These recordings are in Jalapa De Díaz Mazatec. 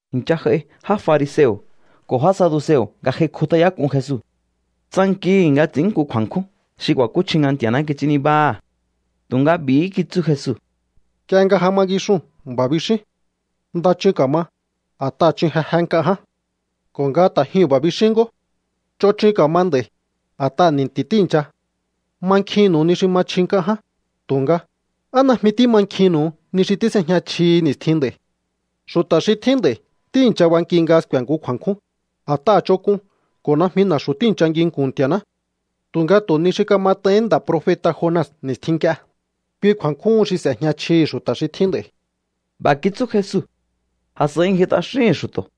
I̱ncha j'ai já fariseo̱ ko̱ já saduseo̱ nga j'ai kjut'ayák'un Jesu. Tsankihi̱ nga ts'i̱ín nku kju̱a̱nkjún xi ku̱a̱kúchji nga Nti̱a̱ná kits'ín nibáha̱. Tunga b'i̱hí kitsú Jesu: —Nk'ie nga ja ma ngixuu̱n b'a̱ bixíún: “Nda chun ka̱ma, a̱t'aha̱ chun jeje nk'a ján.” Ko̱ nga ta̱ jyuu̱n b'a̱ bixín ngó: “Ch'on chun ka̱ma nd'a̱i̱, a̱t'aha̱ ni̱nti̱ tíi̱ncha.” Mankjinnu̱u ni xi ma chji nk'a ján, tu̱nga, ¿á najmi tímankjihi̱nnu̱u ni xi tís'ejña chjihi ni̱stjin nd'a̱i̱? Xu̱ta̱ xi tjín nd'a̱i̱ tíi̱ncha banki nga sku̱e̱ nku kju̱a̱nkjún, a̱t'aha̱ ch'onk'un ko̱ najmi na̱xu̱ tíi̱ncha nginku̱n Nti̱a̱ná. Tu̱nga tu̱ ni xi kamat'aihín nda̱ profeta̱ Jona ni̱stjin nk'ie, kui kju̱a̱nkjúhun xi s'e̱jña chjihi̱ xu̱ta̱ xi tjín nd'a̱i̱. B'a̱ kitsú Jesu, a̱s'a̱i ngji t'axíhi̱n xu̱to̱.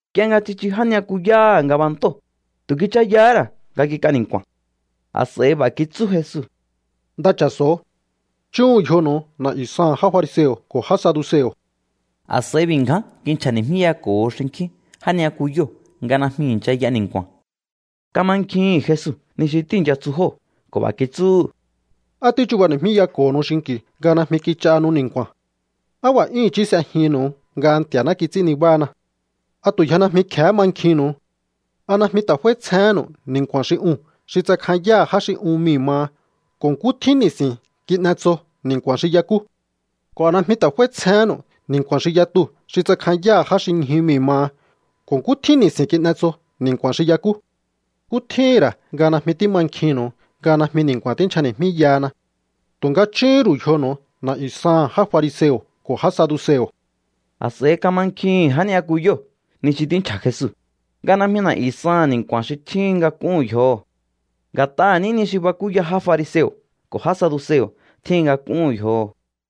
Nk'ie nga tsichu já ni'yakuyáha̱ ngabantóo̱, tu̱ kichayahá ra̱ nga kik'a ni̱nku̱a̱n. A̱s'a̱i b'a̱ kitsú Jesu: —Nda cha̱so̱o. Chúhu̱un yjonu̱u na̱'yu̱ saha̱n já fariseo̱ ko̱ já saduseo̱. A̱s'a̱i b'i̱ ngján kinchja̱ni̱jmíyako̱ho xinkjín já ni'yakuyóo̱ nga najmi i̱ncha y'a ni̱nku̱a̱n. Kamankjihi̱n Jesu ni xi tíi̱ncha tsu jóo̱ ko̱ b'a̱ kitsúhu̱: —¿Á tíchubani̱jmíyako̱honu xinki̱u nga najmi kich'ahanu ni̱nku̱a̱n? ¡Á b'a̱ 'yún i̱chí s'ejihi̱nnu̱u nga Nti̱a̱ná kits'ín nibána! ¿A tu̱ yje najmi kje̱hé mankjinnu̱u? ¿A najmi ta̱ f'áítsjehénnu̱u ni̱nku̱a̱n xi uu̱n xi tsakjanyáha̱ já xi un mii̱ maha ko̱ nkú tjín ni̱si̱n kin'etso ni̱nku̱a̱n xi y'ekú? ¿Ko̱ a najmi ta̱ f'áítsjehénnu̱u ni̱nku̱a̱n xi yatuu̱ xi tsakjanyáha̱ já xi ñju mii̱ maha ko̱ nkú tjín ni̱si̱n kin'etso ni̱nku̱a̱n xi y'ekú? ¿Nkú tjíhi̱n ra̱ nga najmi tímankjihi̱nnu̱u nga najmi ni̱nku̱a̱n tínchjani̱jmíyahana? Tu̱nga chúhún ru̱u yjonu̱u na̱'yu̱ saha̱n já fariseo̱ ko̱ já saduseo̱. A̱s'a̱i kamankjihi̱n já ni'yakuyóo̱ ni xi tínchja̱ Jesu, nga najmi na̱'yu̱ saha̱n ni̱nku̱a̱n xi tjíhin nga kúhu̱n yjoho̱. Nga̱t'aha̱ ní ni xi bakúya já fariseo̱ ko̱ já saduseo̱ tjíhin nga kúhu̱n yjoho̱.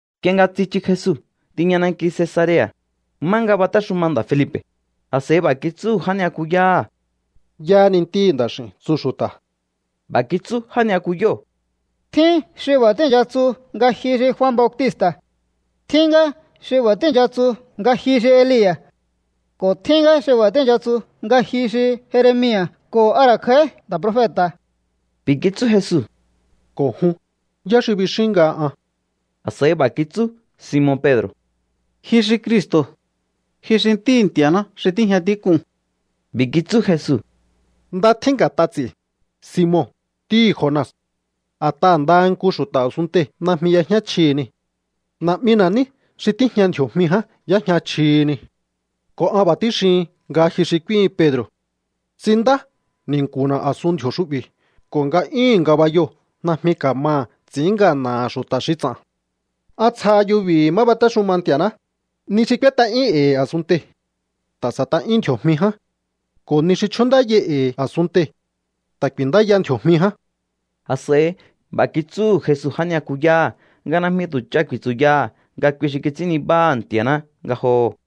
Nk'ie nga tsichu Jesu tiña nanki Cesarea̱, má nga batéxuma nda̱ Felipe̱, a̱s'a̱i b'a̱ kitsúhu̱ já ni'yakuyáha̱: —¿Yáhá ni Ntíhi̱ Nda̱x'i̱u̱n tsu xu̱ta̱? B'a̱ kitsú já ni'yakuyóo̱: —Tjín xi b'a̱ tíi̱ncha tsu nga ji xi Jua Bautista̱. Tjín ngá xi b'a̱ tíi̱ncha tsu nga ji xi Elia̱. Ko̱ tjín ngá xi b'a̱ tíi̱ncha tsu nga ji xi Jeremia̱ ko̱ a ra̱ kj'a̱í nda̱ profeta̱. B'i̱ kitsú Jesu: —Ko̱ jun, ¿yá xi bixíún nga an? A̱s'a̱i b'a̱ kitsú Simon Pedro̱: —Ji xi Cristo̱. Ji xi Ntíhi̱ Nti̱a̱ná xi tíjña tík'uu̱n. B'i̱ kitsú Jesu: —Nda tjín nga̱t'a ts'i̱, Simon, ntíhi̱ Jona. A̱t'aha̱ ndaha nku xu̱ta̱ a̱sunntei̱ najmi y'éjña chjihi nii̱. Na̱'mina̱ ní xi tíjña ndji̱o̱jmi ján y'éjña chjihi nii̱. Ko̱ an b'a̱ tíxihin nga ji xi k'úíhin Pedro̱. Ts'inndá ni̱nku̱na̱ a̱suhu̱n ndji̱o̱ xu'bi̱ ko̱ nga'yúhu̱n ngabayoo̱ najmi ka̱maha̱ ts'i̱ín ngana̱ha̱ xu̱ta̱ xi ts'a̱n. An tsjaha yubi̱hi̱ má batéxuma Nti̱a̱ná. Ni xi k'úét'a'yín e̱i̱ a̱sunntei̱, ta̱ s'e̱t'a'yún ndji̱o̱jmi ján. Ko̱ ni xi chjúndáyai e̱i̱ a̱sunntei̱, ta̱ ku̱i̱ndáya ndji̱o̱jmi ján. A̱s'a̱i b'a̱ kitsúhu̱ Jesu já ni'yakuyáha̱ nga najmi tu̱ ch'a ku̱i̱tsu̱yaha̱ nga kui xi kits'ín nibáha̱ Nti̱a̱ná ngajoho̱.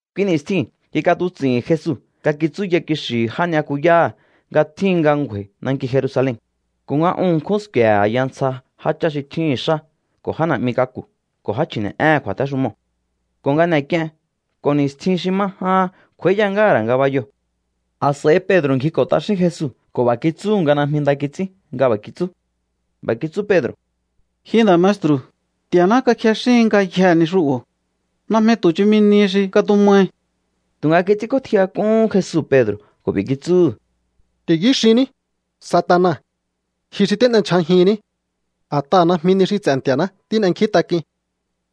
Kui ni̱stjiu̱n kik'atuts'i̱hi̱n Jesu nga kitsúya kixi̱hi̱ já ni'yakuyáha̱ nga tjíhin nga ngju̱a̱i̱ nanki Jerusalen, ko̱ nga un ṉkjún sku̱e̱he̱ a̱ya ntsja jáchá xi tjíhi̱n xá ko̱ já na̱'mi k'aku̱ ko̱ já chji̱ne̱'éhe̱n kju̱a̱téxumoo̱, ko̱ nga n'e̱k'ien ko̱ ni̱stjin xi ma jahan kj'u̱a̱íya ngáha̱ ra̱ ngabayoo̱. A̱s'a̱i Pedro̱ ngjiko̱ t'axín Jesu ko̱ b'a̱ kitsúhu̱ nga najmi nda kits'ín nga b'a̱ kitsú. B'a̱ kitsú Pedro̱: —¡Ji nda̱ maestru̱, Nti̱a̱ná kakjexíhin ngayjee̱ ni xu'bo̱! ¡Najmi tu̱ chumi nihi xi katumahi! Tu̱nga kits'ínk'ótjiyak'uhún Jesu Pedro̱ ko̱ b'i̱ kitsúhu̱: —¡Ti̱yú xinní, Satana! Ji xi tín'endyja̱jinní. A̱t'aha̱ najmi ni xi ts'e̱ Nti̱a̱ná tín'enkjíntak'uin.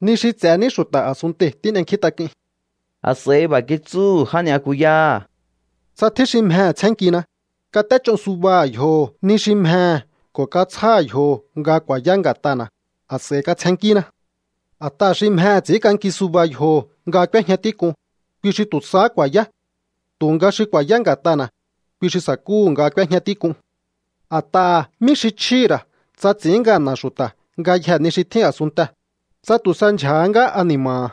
Ni xi ts'e̱ ní xu̱ta̱ a̱sunntei̱ tín'enkjíntak'uin. A̱s'a̱i b'a̱ kitsúhu̱ já ni'yakuyáha̱: —Tsa tjín xi mjehe̱ tsjénnkina, kat'éch'o subaha̱ yjoho̱ ni xi mjehe̱ ko̱ katsjáha̱ yjoho̱ nga ku̱a̱yá nga̱t'ana̱, a̱s'a̱i katsjennkína. A̱t'aha̱ xi mjehe̱ ts'i̱ínk'anki suba yjoho̱ nga k'úéjña tík'un, kui xi tu̱ sahá ku̱a̱yá. Tu̱nga xi ku̱a̱yá nga̱t'ana̱, kui xi sa̱kúhu̱ nga k'úéjña tík'un. A̱t'aha̱, ¿mí xi chjíhi̱ ra̱ tsa ts'i̱ín ngana̱ xu̱ta̱ ngayjee̱ ni xi tjín a̱sunntee̱, tsa tu̱ sa ndyja̱há ngá ani̱ma̱ha̱?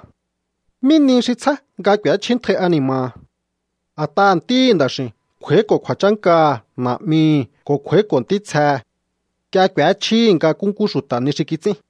¿Mí nihi xi tsjá nga k'u̱échjíntjai ani̱ma̱ha̱? A̱t'aha̱ Ntíhi̱ Nda̱x'i̱u̱n kj'u̱a̱íko̱ kju̱a̱chánkaha̱ Na̱'mihi̱ ko̱ kj'u̱a̱íko̱ ntítsjehe̱. Nk'ie k'u̱échjíhi̱ nga nkúnkú xu̱ta̱ ni xi kits'ín.